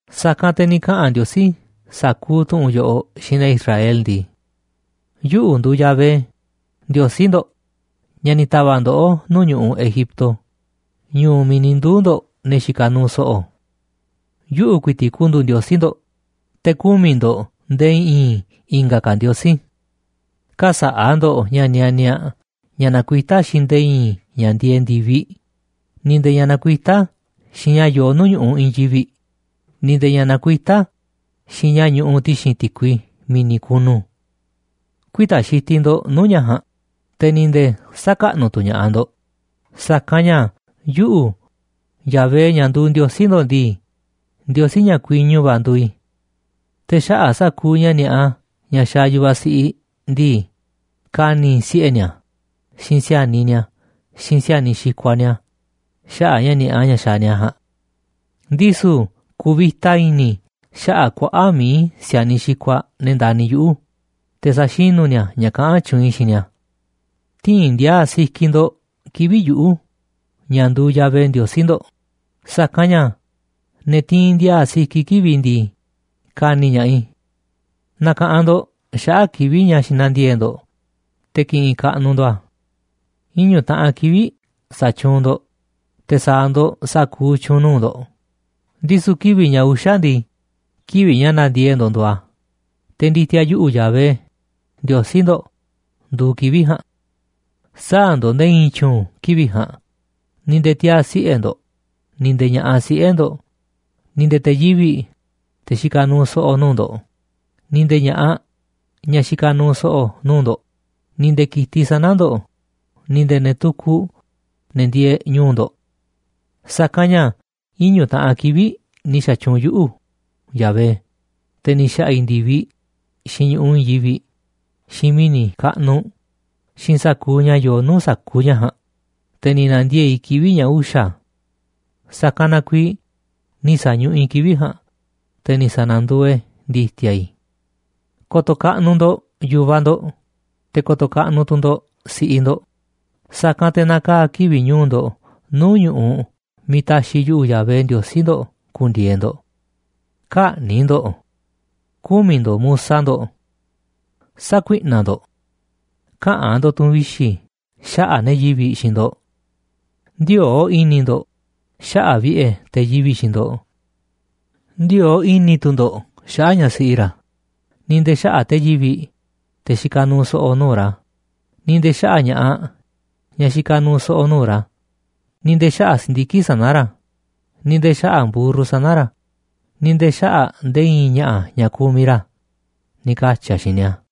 Sa̱kanꞌ te̱ ni̱ kaꞌa̱n Ndiosí sa̱kuuꞌ tu̱ꞌu̱n yoꞌoꞌ xiinꞌ ne̱ Israel ndii: ―Yuꞌu̱ nduuꞌ Yahvé, Ndiosí ndo̱ꞌ, ña̱ ni̱ ta̱va̱ꞌ ndoꞌó nuu̱ꞌ ñu̱ꞌuꞌ Egipto, ñu̱u̱ miiꞌ ni̱ nduu̱ ne̱ xikaꞌ nuuꞌ so̱ꞌo̱. ’Yuꞌu̱ ku̱i̱ti̱ꞌ ku̱ndu̱u̱ Ndiosí ndo̱ꞌ, te̱ kü̱miꞌ ndo̱ꞌ nde̱e̱ i̱i̱n i̱nga̱ ndiosí. ’Kä̱sa̱ꞌa̱ ndo̱ꞌ ña̱ nianiaꞌ, ña̱ nakuitá xiinꞌ nde̱e̱ i̱i̱n ña̱ ndieeꞌ ndi̱viꞌ, ni̱ nde̱e̱ ña̱ nakuitá xiinꞌ ña̱ yoo nuu̱ꞌ ñu̱ꞌuꞌ i̱i̱n yivi̱ꞌ, ni̱ nde̱e̱ ña̱ nakuitá xiinꞌ ña̱ ñuꞌuꞌ ti̱xi̱n ti̱kui mi̱ni̱ kunu. Kü̱i̱ta̱ xitiꞌ ndo̱ꞌ nuu̱ꞌ ña̱ ja̱a̱nꞌ, te̱ ni̱ nde̱e̱ sä̱kaꞌnuꞌ tu̱ ña̱ꞌaꞌ ndo̱ꞌ, sa̱kanꞌ ña̱ yuꞌu̱, Yahvé, ña̱ nduuꞌ Ndiosí ndo̱ꞌ ndii, Ndiosí ña̱ kuiñu va̱ nduuꞌ i̱. Te̱ xaꞌa̱ꞌ sa̱kuuꞌ ña̱ ni̱a̱ꞌa ña̱ xaaꞌ yu̱vaꞌ siꞌiꞌ ndii, ka̱ni̱ i̱ siꞌe̱ ni̱a̱, xiinꞌ si̱a̱niꞌ ni̱a̱, xiinꞌ si̱a̱niꞌ xikuaꞌ ni̱a̱ xaꞌa̱ꞌ ña̱ ni̱a̱ꞌa ña̱ xaaꞌ ni̱a̱ ja̱a̱nꞌ. Ndisu̱ ku̱vi̱ta i̱ni̱ i̱ xaꞌa̱ꞌ kuaꞌa̱ꞌ mií si̱a̱niꞌ xikuaꞌ, ne̱ ndani̱ yuꞌu̱, te̱ sa̱xinu̱ ni̱a̱ ña̱ kaꞌán tyuunꞌ i̱ xiinꞌ ni̱a̱. ’Tï̱i̱n ndi̱a̱a̱ sikiꞌ ndo̱ꞌ kivi̱ꞌ yuꞌu̱, ña̱ nduuꞌ Yahvé Ndiosí ndo̱ꞌ, sa̱kanꞌ ña̱ ne̱ tiinꞌ ndiaa sikiꞌ kivi̱ꞌ i̱ ndii, ka̱ni̱ ña̱ꞌaꞌ i̱. ’Na̱ka̱ꞌanꞌ ndo̱ꞌ xaꞌa̱ꞌ kivi̱ꞌ ña̱ xinandiee̱ꞌ ndo̱ꞌ, te̱ ki̱ꞌi̱nꞌ kaꞌnuꞌ ndo̱ꞌ a̱. Iñu̱ taꞌan kivi̱ꞌ sa̱tyuunꞌ ndo̱ꞌ, te̱ sa̱a̱ ndo̱ꞌ sa̱kuuꞌ tyu̱u̱n nuu̱ꞌ ndo̱ꞌ. Ndisu̱ kivi̱ꞌ ña̱ uxa̱ ndii, kivi̱ꞌ ña̱ na̱ndiee̱ꞌ ndo̱ꞌ nduuꞌ a̱, te̱ ndi̱ti̱a̱ yuꞌu̱, Yahvé, Ndiosí ndo̱ꞌ, nduuꞌ kivi̱ꞌ ja̱a̱nꞌ. Sä̱a̱ ndo̱ꞌ nde̱e̱ i̱i̱n tyu̱u̱n kivi̱ꞌ ja̱a̱nꞌ, ni̱ nde̱e̱ tiaa̱ siꞌe̱ ndo̱ꞌ, ni̱ nde̱e̱ ña̱ꞌaꞌ siꞌe̱ ndo̱ꞌ, ni̱ nde̱e̱ te̱ yivi̱ꞌ, te̱ xikaꞌ nuuꞌ so̱ꞌo̱ nuu̱ꞌ ndo̱ꞌ, ni̱ nde̱e̱ ña̱ꞌaꞌ, ñaꞌ xikaꞌ nuuꞌ so̱ꞌo̱ nuu̱ꞌ ndo̱ꞌ, ni̱ nde̱e̱ ki̱tiꞌ sana̱ ndo̱ꞌ, ni̱ nde̱e̱ ne̱ tukuꞌ, ne̱ ndieeꞌ ñu̱u̱ ndo̱ꞌ. Sa̱kanꞌ ña̱ iñu̱ taꞌan kivi̱ꞌ ni̱ xa̱tyuunꞌ yuꞌu̱, Yahvé, te̱ ni̱ xa̱ꞌa̱ i̱ ndi̱viꞌ, xiinꞌ ñu̱ꞌuꞌ i̱i̱n yivi̱ꞌ, xiinꞌ mi̱ni̱ kaꞌnuꞌ, xiinꞌ sa̱kuuꞌ ña̱ yoo nuu̱ꞌ sa̱kuuꞌ ña̱ ja̱a̱nꞌ, te̱ ni̱ na̱ndiee̱ꞌ i̱ kivi̱ꞌ ña̱ uxa̱. Sa̱kanꞌ na kuiiꞌ ni̱ sa̱ñuꞌuꞌ i̱ kivi̱ꞌ ja̱a̱nꞌ, te̱ ni̱ sa̱na̱nduuꞌ e̱ ndi̱ti̱a̱ i̱. ’Ko̱to̱ kaꞌnuꞌ ndo̱ꞌ yu̱vaꞌ ndo̱ꞌ, te̱ ko̱to̱ kaꞌnuꞌ tu̱ ndo̱ꞌ si̱ꞌiꞌ ndo̱ꞌ, sa̱kanꞌ te̱ na̱kaa̱ kivi̱ꞌ ñu̱u̱ ndo̱ꞌ nuu̱ꞌ ñu̱ꞌuꞌ miiꞌ ta̱xi̱ yuꞌu̱, Yahvé Ndiosí ndo̱ꞌ, ku̱ndi̱e̱e̱ ndo̱ꞌ. ’Kä̱ꞌni̱ꞌ ndo̱ꞌ. ’Kü̱miꞌ ndo̱ꞌ musa ndo̱ꞌ. ’Sä̱kuiꞌnaꞌ ndo̱ꞌ. ’Käꞌa̱n ndo̱ꞌ tu̱ꞌu̱n vixi̱ xaꞌa̱ꞌ ne̱ yivi̱ꞌ xiinꞌ ndo̱ꞌ. ’Ndï̱o̱o̱ꞌ i̱ni̱ ndo̱ꞌ xaꞌa̱ꞌ vi̱ꞌe̱ te̱ yivi̱ꞌ xiinꞌ ndo̱ꞌ. Ndï̱o̱o̱ꞌ i̱ni̱ tu̱ ndo̱ꞌ xaꞌa̱ꞌ ñaꞌ siꞌi ra̱, ni̱ nde̱e̱ xaꞌa̱ꞌ te̱ yivi̱ꞌ, te̱ xikaꞌ nuuꞌ so̱ꞌo̱ nuu̱ꞌ ra̱, ni̱ nde̱e̱ xaꞌa̱ꞌ ña̱ꞌaꞌ, ñaꞌ xikaꞌ nuuꞌ so̱ꞌo̱ nuu̱ꞌ ra̱, ni̱ nde̱e̱ xaꞌa̱ꞌ si̱ndiki̱ꞌ sana̱ ra̱, ni̱ nde̱e̱ xaꞌa̱ꞌ mburru sana̱ ra̱, ni̱ nde̱e̱ xaꞌa̱ꞌ nde̱e̱ i̱i̱n ña̱ꞌa̱ ña̱ kumiꞌ ra̱ ―ni̱ katyi̱ a̱ xiinꞌ ni̱a̱.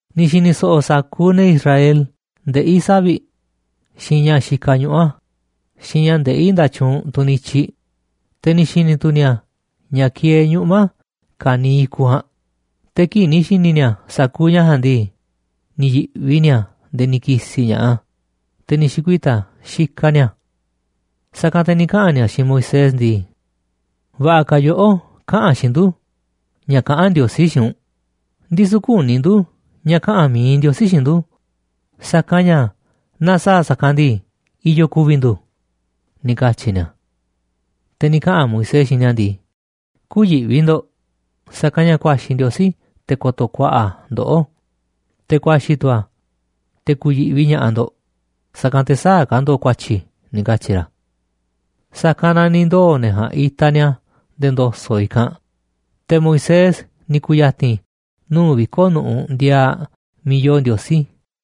Ni̱ xi̱ni̱ so̱ꞌo̱ sa̱kuuꞌ ne̱ Israel ndeꞌí savi̱ꞌ, xiinꞌ ña̱ xikaꞌ ñuꞌu̱ a̱, xiinꞌ ña̱ ndeꞌí nda̱tyuunꞌ tunꞌ nityiꞌ, te̱ ni̱ xi̱ni̱ tu̱ ni̱a̱ ña̱ kieeꞌ ñuꞌma̱ ka̱niiꞌ i̱kuꞌ ja̱a̱nꞌ. Te̱ kii̱ꞌ ni̱ xi̱ni̱ ni̱a̱ sa̱kuuꞌ ña̱ ja̱a̱nꞌ ndii, ni̱ yi̱ꞌvi ni̱a̱ nde̱e̱ ni̱ ki̱si̱ ña̱ꞌaꞌ a̱, te̱ ni̱ xi̱kuita̱ xikaꞌ ni̱a̱. Sa̱kanꞌ te̱ ni̱ kaꞌa̱n ni̱a̱ xiinꞌ Moisés ndii: ―Va̱ꞌa̱ ka̱ yoꞌó kaꞌa̱n xiinꞌ ndu̱ ña̱ kaꞌán Ndiosí xiinꞌ u̱nꞌ, ndisu̱ küní ndu̱ ña̱ kaꞌa̱n mi̱iꞌ Ndiosí xiinꞌ ndu̱, sa̱kanꞌ ña̱ naaꞌ sa̱a̱ a̱ sa̱kanꞌ ndii, i̱yo̱ ku̱vi̱ ndu̱ ―ni̱ katyi̱ ni̱a̱. Te̱ ni̱ kaꞌa̱n Moisés xiinꞌ ni̱a̱ ndii: ―Kü̱yiꞌvi ndo̱ꞌ, sa̱kanꞌ ña̱ ku̱a̱xi̱ Ndiosí te̱ ko̱to̱ ku̱a̱ꞌa̱ a̱ ndoꞌó, te̱ ku̱a̱xi̱ tu̱ a̱ te̱ ku̱yi̱ꞌvi ña̱ꞌaꞌ ndo̱ꞌ, sa̱kanꞌ te̱ sä̱a̱ ka̱ ndo̱ꞌ ku̱a̱tyi̱ ―ni̱ katyi̱ ra̱. Sa̱kanꞌ na ni̱ ndoo̱ ne̱ ja̱a̱nꞌ itaꞌ ni̱a̱ nde̱e̱ ndo̱so̱ꞌ i̱kanꞌ, te̱ Moisés ni̱ ku̱ya̱ti̱n nuu̱ꞌ viko̱ꞌ nu̱ꞌuꞌ ndiaaꞌ miiꞌ yoo Ndiosí.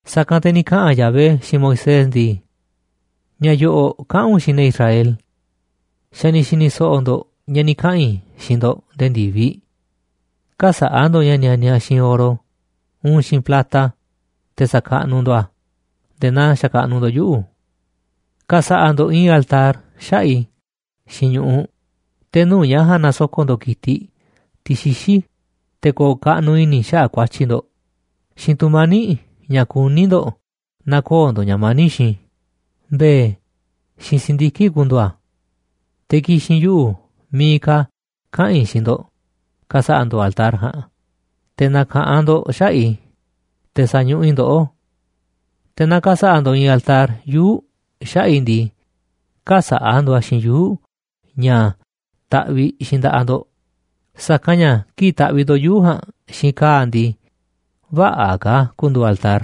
Sa̱kanꞌ te̱ ni̱ kaꞌa̱n Yahvé xiinꞌ Moisés ndii: ―Ña̱ yo̱ꞌo̱ꞌ kaꞌa̱n u̱nꞌ xiinꞌ ne̱ Israel: “Xa̱ ni̱ xi̱ni̱ so̱ꞌo̱ ndo̱ꞌ ña̱ ni̱ kaꞌa̱n i̱ xiinꞌ ndo̱ꞌ nde̱e̱ ndi̱viꞌ. Kä̱sa̱ꞌa̱ ndo̱ꞌ ña̱ nianiaꞌ xiinꞌ oro uun xiinꞌ plata, te̱ sa̱kaꞌnuꞌ ndo̱ꞌ a̱ nde̱e̱ naa xakaꞌnuꞌ ndo̱ꞌ yuꞌu̱. Ka̱sa̱ꞌa̱ ndo̱ꞌ i̱i̱n altar xaꞌa̱ꞌ i̱ xiinꞌ ñu̱ꞌuꞌ, te̱ nuu̱ꞌ ña̱ ja̱a̱nꞌ na̱soko̱ꞌ ndo̱ꞌ ki̱tiꞌ, tiꞌ xixí, te̱ ko̱o̱ kaꞌnuꞌ i̱ni̱ i̱ xaꞌa̱ꞌ ku̱a̱tyi̱ ndo̱ꞌ, xiinꞌ tu̱mani̱ꞌ ña̱ kuní ndo̱ꞌ na̱koo̱ ndo̱ꞌ ña̱ mani̱ꞌ xiinꞌ i̱, mbe̱e̱, xiinꞌ si̱ndiki̱ꞌ ku̱ndu̱u̱ a̱. Te̱ ki̱xi̱n yuꞌu̱ miiꞌ ka̱ kaꞌa̱n i̱ xiinꞌ ndo̱ꞌ ka̱sa̱ꞌa̱ ndo̱ꞌ altar ja̱a̱nꞌ te̱ na̱ka̱ꞌanꞌ ndo̱ꞌ xaꞌa̱ꞌ i̱, te̱ sa̱ñuꞌuꞌ i̱ ndoꞌó. Te̱ naaꞌ ka̱sa̱ꞌa̱ ndo̱ꞌ i̱i̱n altar yuu̱ꞌ xaꞌa̱ꞌ i̱ ndii, kä̱sa̱ꞌa̱ ndo̱ꞌ a̱ xiinꞌ yuu̱ꞌ ña̱ taꞌviꞌ xiinꞌ nda̱ꞌaꞌ ndo̱ꞌ, sa̱kanꞌ ña̱ kii̱ꞌ taꞌviꞌ ndo̱ꞌ yuu̱ꞌ ja̱a̱nꞌ xiinꞌ ka̱a̱ ndii, vä̱ꞌa̱ ka̱ a̱ ku̱ndu̱u̱ altar.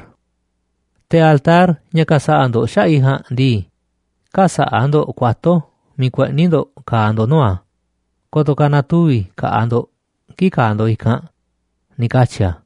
Te̱ altar ña̱ ka̱sa̱ꞌa̱ ndo̱ꞌ xaꞌa̱ꞌ i̱ ja̱a̱nꞌ ndii, kä̱sa̱ꞌa̱ ndo̱ꞌ kuato̱ miiꞌ kueꞌni̱ ndo̱ꞌ ka̱a̱ ndo̱ꞌ nuu̱ꞌ a̱, ko̱to̱ ka̱ na̱tuvi̱ ka̱ꞌaꞌ ndo̱ꞌ kii̱ꞌ ka̱a̱ ndo̱ꞌ i̱kanꞌ” ―ni̱ katyi̱ a̱.